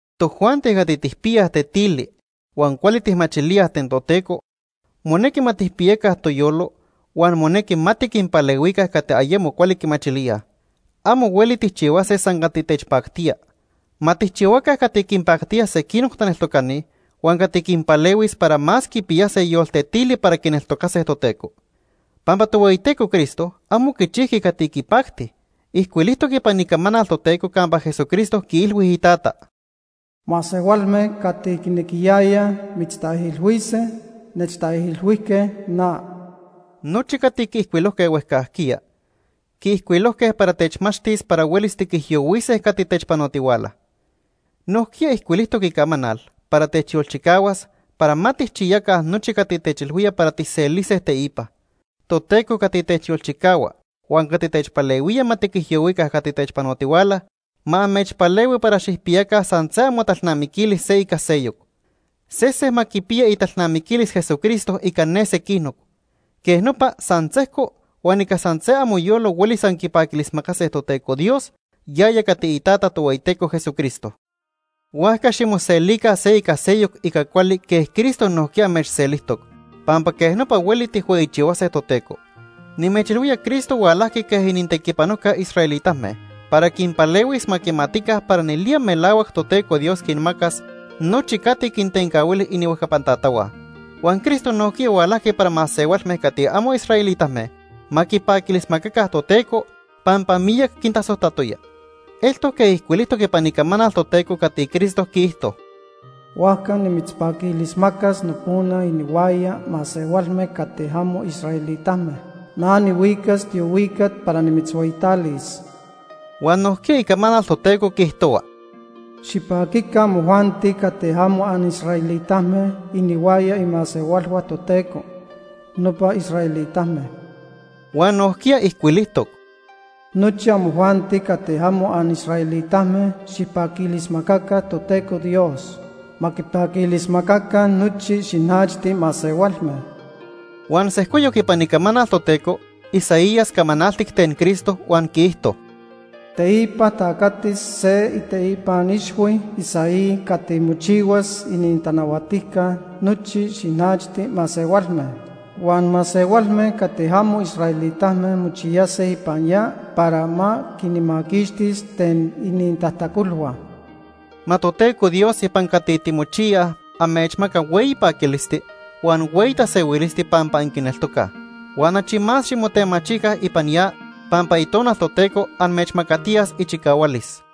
Tojuanti cati tijpiyaj tetili huan cuali tijmachilíaj ten Toteco, monequi ma tijpiyaca toyolo huan monequi ma tiquinpalehuica cati ayemo cuali quimachilíaj. Amo hueli tijchihuase san cati techpactía. Ma tijchihuaca cati quinpactía sequinoc taneltocani huan cati quinpalehuis para más quipiyase yoltetili para quineltocase Toteco. Pampa Tohueyiteco Cristo amo quichijqui cati quipacti. Ijcuilijtoc ipan Icamanal Toteco campa Jesucristo quiilhui Itata: “Masehualme cati quinequiyayaj mitztaijilhuise, nechtaijilhuijque na.” Nochi cati quiijcuilojque huejcajquiya, quiijcuilojque para techmachtis para huelis tiquijyohuise cati techpanotihuala. Nojquiya ijcuilijtoc Icamanal para techyolchicahuas para ma tijchiyaca nochi cati techilhuía para tijselise teipa. Toteco cati techyolchicahua huan cati techpalehuía ma tiquijyohuica cati techpanotihuala, ma amechpalehui para xijpiyaca san se amotalnamiquilis se ica seyoc. Sesen ma quipiya italnamiquilis Jesucristo ica ne sequinoc. Quej nopa san sejco huan ica san se amoyolo huelis anquipaquilismacase Toteco Dios, yaya cati iTata Tohueyiteco Jesucristo. Huajca ximoselica se ica seyoc ica cuali quej Cristo nojquiya amechselijtoc, pampa quej nopa hueli tijhueyichihuase Toteco. Nimechilhuía Cristo hualajqui quej inintequipanojca israelitame para quinpalehuis ma quimatica para nelía melahuac Toteco Dios quinmacas nochi cati quintencahuili inihuejcapan tatahua. Huan Cristo nojquiya hualajqui para masehualme cati amo israelitame ma quipaquilismacaca Toteco pampa miyac quintasojtatoya. Eltoc quej ijcuilijtoc ipan Icamanal Toteco cati Cristo quiijto: “Huajca nimitzpaquilismacas nopona inihuaya masehualme cati amo israelitame. Na nihuicas tiohuicat para nimitzhueyitalis.” Huan nojquiya Icamanal Toteco quiijtohua: “Xipaquica amojuanti cati amo anisraelitame inihuaya imasehualhua Toteco, nopa israelitame.” Huan nojquiya ijcuilijtoc: “Nochi amojuanti cati amo anisraelitame xijpaquilismacaca Toteco Dios. Ma quipaquilismacaca nochi xinachti masehualme.” Huan sejcoyoc ipan Icamanal Toteco, Isaías camanaltic ten Cristo huan quiijto: “Teipa tacatis se iteipan ixhui Isaí cati mochihuas inintanahuatijca nochi xinachti masehualme. Huan masehualme cati amo israelitame mochiyase ipan ya para ma quinmaquixtis ten inintajtacolhua.” Ma Toteco Dios ipan cati timochiyaj, amechmaca hueyi paquilisti, huan hueyi tasehuilisti pampa anquineltocaj. Huan achi más ximotemachica ipan ya pampa Itonal Toteco amechmacatiyas ichicahualis.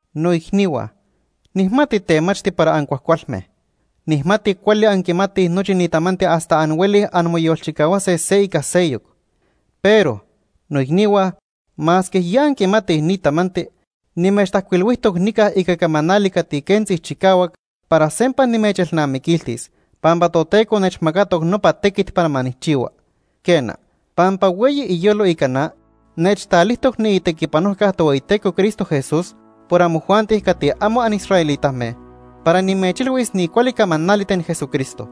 Noicnihua, nijmati temachti para ancuajcualme. Nijmati cuali anquimatij nochi ni tamanti hasta anhuelij anmoyolchicahuase se ica seyoc. Pero, noicnihua, masque ya anquimatij ni tamanti, nimechtajcuilhuijtoc nica ica camanali cati quentzi chicahuac para sempa nimechelnamiquiltis pampa Toteco nechmacatoc nopa tequit para ma nijchihua. Quena, pampa hueyi iyolo ica na, nechtalijtoc niitequipanojca Tohueyiteco Cristo Jesús por amojuanti cati amo anisraelitame para nimechilhuis ni cuali camanali ten Jesucristo.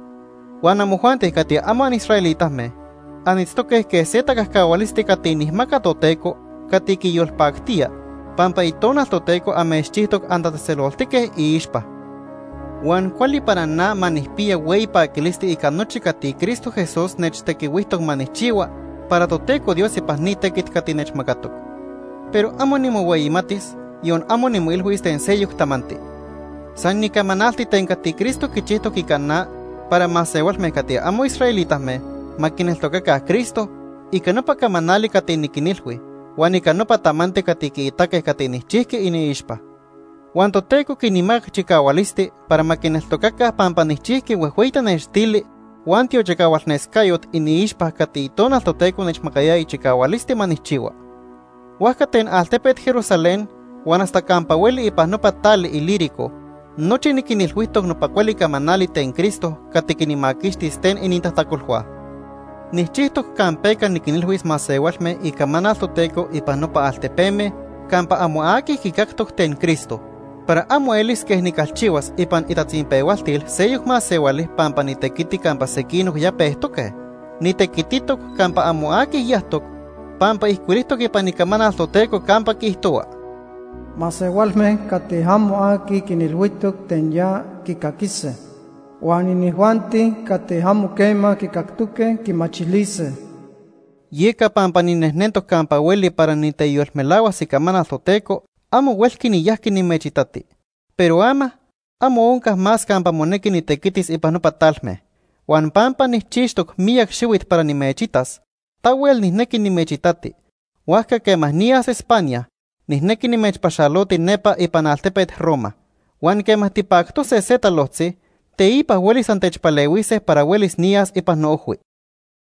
Huan amojuanti cati amo anisraelitame anitztoque quej se tacajcahualisti cati nijmaca Toteco cati quiyolpactía, pampa Itonal Toteco amechchijtoc antatzejtzeloltique iixpa. Huan cuali para na ma nijpiya hueyi paquilisti ica nochi cati Cristo Jesús nechtequihuijtoc ma nijchihua para Toteco Dios ipan ni tequit cati nechmacatoc. Pero amo nimohueyimatis, yon amo nimoilhuis ten seyoc tamanti. San nicamanalti ten cati Cristo quichijtoc ica na para masehualme cati amo israelitame ma quineltocaca Cristo ica nopa camanali cati niquinilhui huan ica nopa tamanti cati quiitaque cati nijchijqui iniixpa. Huan Toteco quinmacac chicahualisti para ma quineltocaca pampa nijchijqui huejhueyi tanextili huan tiochicahualnescayot iniixpa cati Itonal Toteco nechmacayaya chicahualisti ma nijchihua. Huajca ten altepet Jerusalén huan hasta campa hueli ipan nopa tali Ilírico nochi niquinilhuijtoc nopa cuali camanali ten Cristo cati quinmaquixtis ten inintajtacolhua. Nijchijtoc campeca niquinilhuis masehualme icamanal Toteco ipan nopa altepeme campa amo aqui quicactoc ten Cristo, para amo elis quej nicalchihuas ipan itatzinpehualtil seyoc masehuali pampa nitequiti campa sequinoc ya pejtoque. Nitequititoc campa amo aqui yajtoc pampa ijcuilijtoc ipan Icamanal Toteco campa quiijtohua: “Masehualme cati amo aqui quinilhuijtoc ten ya, quicaquise. Huan inijuanti cati amo quema quicactoque, quimachilise.” Yeca pampa ninejnentoc campa hueli para niteyolmelahuas icamanal Toteco, amo huelqui niyajqui nimechitati. Pero ama, amo onca más campa monequi nitequitis ipan nopa talme. Huan pampa nijchixtoc miyac xihuit para nimechitas, tahuel nijnequi nimechitati, huajca quema niyas España, nijnequi nimechpaxaloti nepa ipan altepet Roma. Huan quema tipactose se talojtzi, teipa huelis antechpalehuise para huelis niyas ipan noojhui.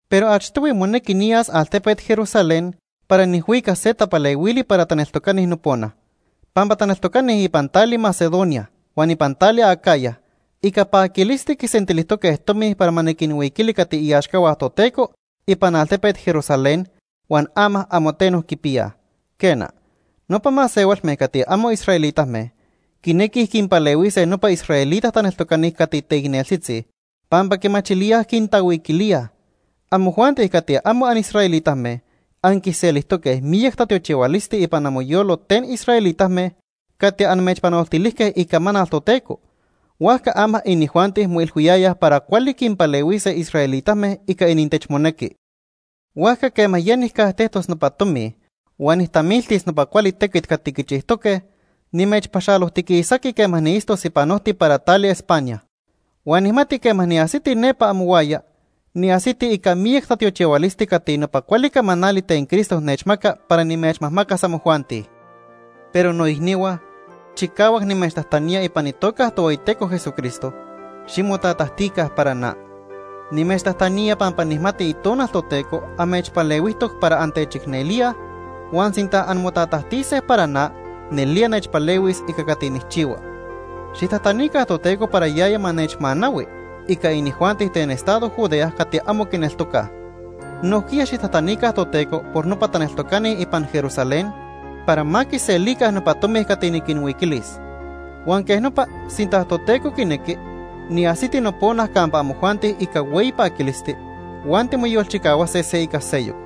Pero achtohui monequi niyas altepet Jerusalén para nijhuicas se tapalehuili para taneltocani nopona. Pampa taneltocani ipan tali Macedonia huan ipan tali Acaya ica paquilisti quisentilijtoque tomi para ma niquinhuiquili cati iaxcahua Toteco ipan altepet Jerusalén huan ama amo teno quipiyaj. Quena, nopa masehualme cati amo israelitame quinequij quinpalehuise nopa israelita taneltocani cati teicneltzitzi, pampa quimachilíaj quintahuiquilíaj. Amojuanti cati amo anisraelitame anquiselijtoque miyac tatiochihualisti ipan amoyolo ten israelitame cati amechpanoltilijque icamanal Toteco, huajca ama inijuanti moilhuiyayaj para cuali quinpalehuise israelitame ica inintechmonequi. Huajca quema ya nijcajtejtos nopa tomi huan nijtamiltis nopa cuali tequit cati quichijtoque, nimechpaxalojtiquisati quema niitztos ipan ojti para tali España. Huan nijmati quema niajsiti nepa amohuaya, niajsiti ica miyac tatiochihualisti cati nopa cuali camanali ten Cristo nechmaca para nimechmajmacas amojuanti. Pero noicnihua, chicahuac nimechtajtanía ipan itoca Tohueyiteco Jesucristo, ximotatajtica para na. Nimechtajtanía pampa nijmati Itonal Toteco amechpalehuijtoc para antechicnelíaj huan sinta anmotatajtise para na nelía nechpalehuis ica cati nijchihua. Xijtajtanica Toteco para yaya ma nechmanahui ica inijuanti ten estado Judea cati amo quineltocaj. Nojquiya xijtajtanica Toteco por nopa taneltocani ipan Jerusalén para ma quiselica nopa tomi cati niquinhuiquilis. Huan quej nopa sinta Toteco quinequi, niajsiti nopona campa amojuanti ica hueyi paquilisti, huan timoyolchicahuase se ica seyoc.